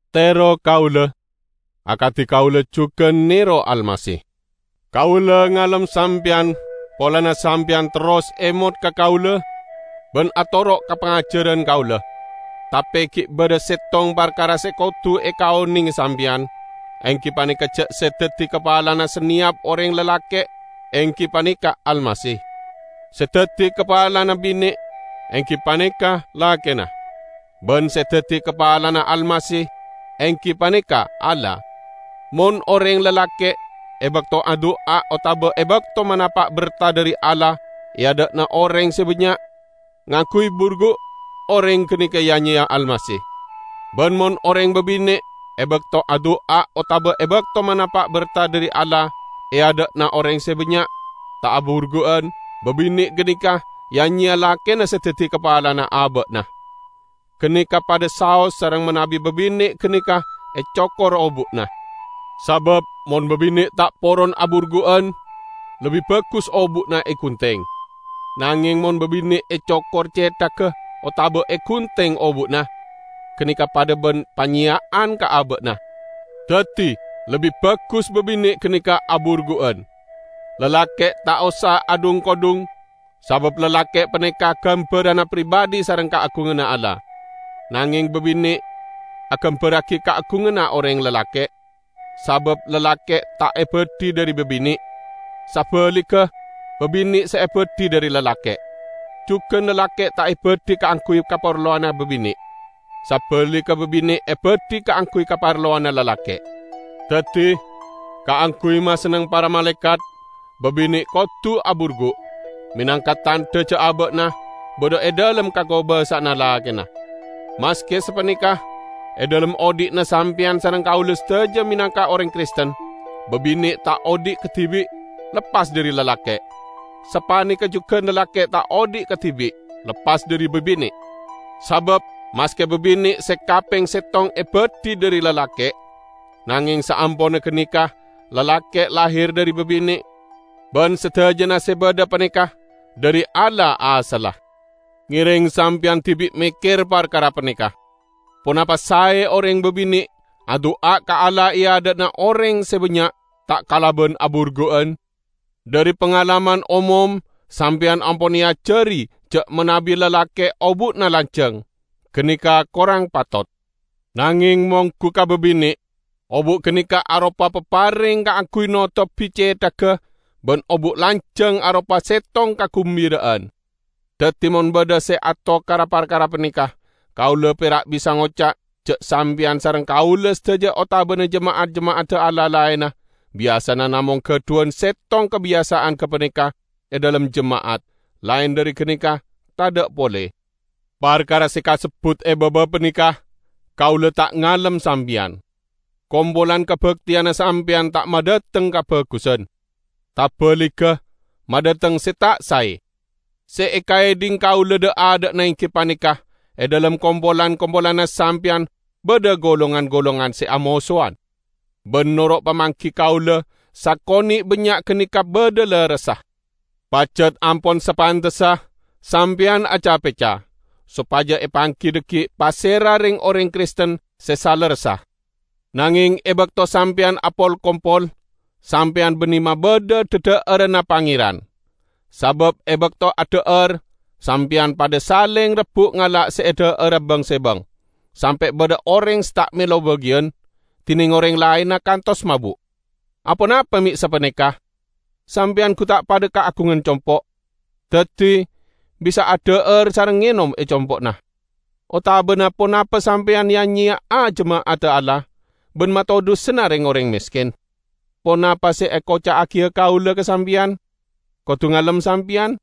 Tero kaula, akadi kaula jugan nero Almasih. Kaula ngalem sampeyan polana sampeyan terros emot ka kaula ban atoro' ka pangajaran kaula. Tape gi' badha settong parkara se kodu ekaonenge sampeyan, enggi paneka ja' se daddi kapalana saneyap oreng lalake' enggi paneka Almasih; se daddi kapalana bine enggi paneka lakena, ban se daddi kapalana Almasih enggi paneka Allah. Mon oreng lalake' e bakto adu'a otaba e bakto manapa' berta dhari Allah e adha'na oreng se bannya', ngangguy burgu', oreng ganeka ya-nyeya Almasih. Ban mon oreng babine' e bakto adu'a otaba e bakto manapa' berta dhari Allah e adha'na oreng se bannya', ta' aburgu'an, babine' ganeka ya-nyeya lakena se daddi kapalana aba'na. Ganeka padha saos sareng manabi babine' ganeka ecokor obu'na. Sabab mon babine' ta' poron aburgu'an lebbi bagus obu'na egunteng. Nangeng mon babine' ecokor cethagga otaba egunteng obu'na, ganeka padha ban panyeya'an ka aba'na. Daddi, lebbi bagus babine' ganeka aburgu'an. Lalake' ta' osa adhung-kodhung, sabab lalake' paneka gambaranna pribadhi sareng kaagunganna Allah. Nangeng babine' agambarragi kaagunganna oreng lalake', sabab lalke' ta' ebadhi dhari babine', sabaligga babine' se ebadhi dhari lalake'. Jugan lalake' ta' ebadhi kaangguy kaparlowanna babine', sabaligga babine' ebadhi kaangguy kaparlowanna lalake'. Daddi, kaangguy masenneng para malaekat, babine' kodu aburgu', menangka tandha ja' aba'na badha e dhalem kakobasa'anna lakena. Maske sapaneka, e dhalem odhi'na sampeyan sareng kaula sadaja menangka oreng Kristen, babine' ta' odhi' kadibi', leppas dhari lalake', sapaneka jugan lalake' ta' odhi' kadibi', leppas dhari babine'. Sabab maske babine' se kapeng settong ebadhi dhari lalake', nangeng saamponna ganeka lalake' lahir dhari babine' ban sadajana se badha paneka dhari Allah asalla. Ngereng sampeyan dibi' mekker parkara paneka: Ponapa sae oreng babine' adu'a ka Allah e adha'na oreng se bannya' ta' kalaban aburgu'an? Dhari pangalaman omom sampeyan ampon eajari ja' manabi lalake' obu'na lanjang, ganeka korang patot. Nangeng monggu ka babine', obu' ganeka aropa papareng kaangguy notobi cethagga ban obu' lanjang aropa settong kagumbira'an. Daddi mon badha se atokara parkara paneka, kaula pera' bisa ngoca' ja' sampeyan sareng kaula sadaja otabana jema'at-jema'adda Allah laenna, biyasana namong gadhuwan settong kabiyasa'an gapaneka e dhalem jema'at; laen dhari ganeka tadha' pole. Parkara se kasebbut e baba paneka, kaula ta' ngalem sampeyan. Kompolan kabakteyanna sampeyan ta' madhateng kabagusan; tabaligga, madhateng se ta' sae. Se ekaedhing kaula dha'-adha'na enggi paneka e dhalem kompolan-kompolanna sampeyan badha golongan-golongan se amosowan. Ban noro' pamanggi kaula sakone' bannya' ganeka badha lerressa. Pajat ampon sapantessa sampeyan acapecca, sopaja epanggi dhaggi' pasera reng-oreng Kristen se salerressa. Nangeng e bakto sampeyan apol-kompol, sampeyan banne mabadha dhadha'aranna Pangeran. Sabab e bakto adha'ar, sampeyan padha saleng rebbu' ngala' se edha'ara bang-sebang, sampe' badha oreng se ta' melo bagiyan, dineng oreng laenna kantos mabu'. Aponapa me' sapaneka? Sampeyan gu ta' padha kaagungan compo'? Daddi bisa adha'ar sareng ngenom e compo'na! Otabana ponapa sampeyan ya'-nyeya'a jema'adda Allah ban matodhusana reng-oreng mesken? Ponapa se ekoca'agiya kaula ka sampeyan? Kodu ngalem sampeyan?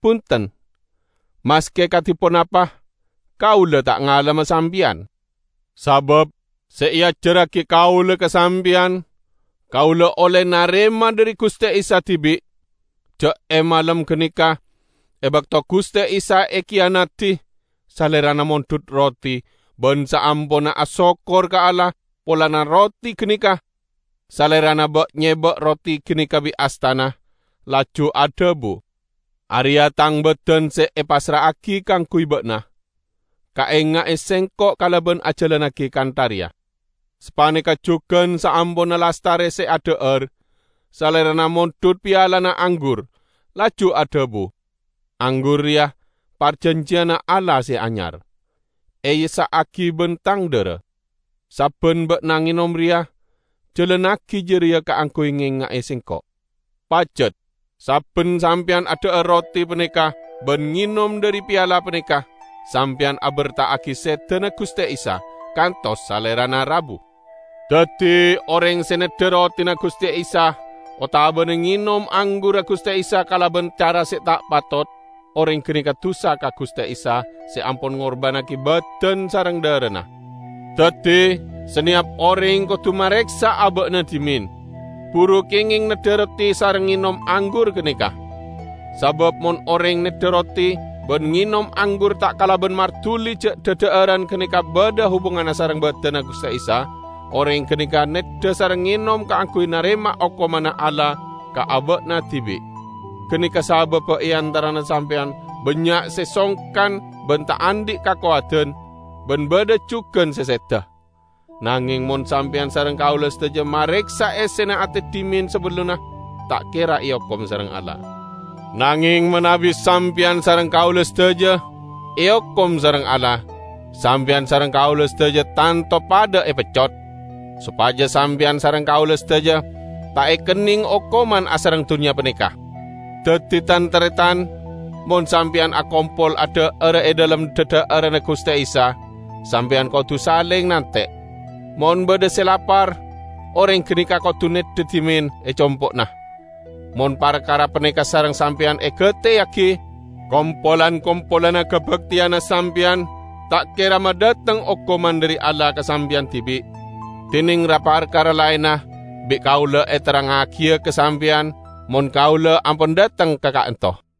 Bunten! Maske kadi ponapa kaula ta' ngalemma sampeyan. Sabab se eajarragi kaula ka sampeyan, kaula olle narema dhari Guste Isa dibi': ja' e malem ganeka, e bakto Guste Isa ekiyanadi, Salerana mondhut roti, ban saamponna asokkor ka Allah polana roti ganeka, Salerana ba'-nyeba' roti ganeka bi' astana, laju adhabu, "Areya' Tang badan se epassra'agi kaangguy ba'na. Kaenga'e Sengko' kalaban ajalannagi kantha reya." Sapaneka jugan saamponna lastare se adha'ar, Salerana mondhut pialana anggur, laju adhabu, "Anggur reya parjanjiyanna Allah se anyar, eessa'agi ban Tang dhara. Sabban ba'na ngenom reya, jalannagi jareya kaangguy ngenga'e Sengko'." Pajat sabban sampeyan adha'ar roti paneka ban ngenom dhari piala paneka, sampeyan aberta'agi sedana Guste Isa, kantos Salerana rabu. Daddi, oreng se neddha rotina Guste Isa otabana ngenom anggurra Guste Isa kalaban cara se ta' patot, oreng ganeka dusa ka Guste Isa se ampon ngorbannagi badan sareng dharana. Daddi saneyap oreng kodu mareksa aba'na dhimen, buru kengeng neddha roti sareng ngenom anggur ganeka. Sabab mon oreng neddha roti ban ngenom anggur ta' kalaban marduli ja' dhadha'aran ganeka badha hubunganna sareng badanna Guste Isa, oreng ganeka neddha sareng ngenom kaangguy narema okomanna Allah ka aba'na dibi'. Ganeka sababba e antarana sampeyan bannya' se songkan ban ta' andhi kakowadan, ban badha jugan se seda. Nangeng mon sampeyan sareng kaula sadaja mareksa essena ate dhimen sabellunna, ta' kera eokom sareng Allah. Nangeng manabi sampeyan kaula sadaja eokom sareng Allah, sampeyan sareng kaula sadaja tanto padha epeccot, sopaja sampeyan sareng kaula sadaja ta' ekenneng okoman asareng dunnya paneka. Daddi, tan-taretan, mon sampeyan akompol adha'ara e dhalem dhadha'aranna Guste Isa, sampeyan kodu saleng nante'. Mon badha se lapar, oreng ganeka kodu neddha dhimen e compo'na. Mon parkara paneka sareng sampeyan egateyagi, kompolan-kompolanna kabakteyanna sampeyan ta' kera madhateng okoman dhari Allah ka sampeyan dibi'. Dineng ra-parkara laenna, bi' kaula eterrangngagiya ka sampeyan, mon kaula ampon dhateng ka ka'anto'.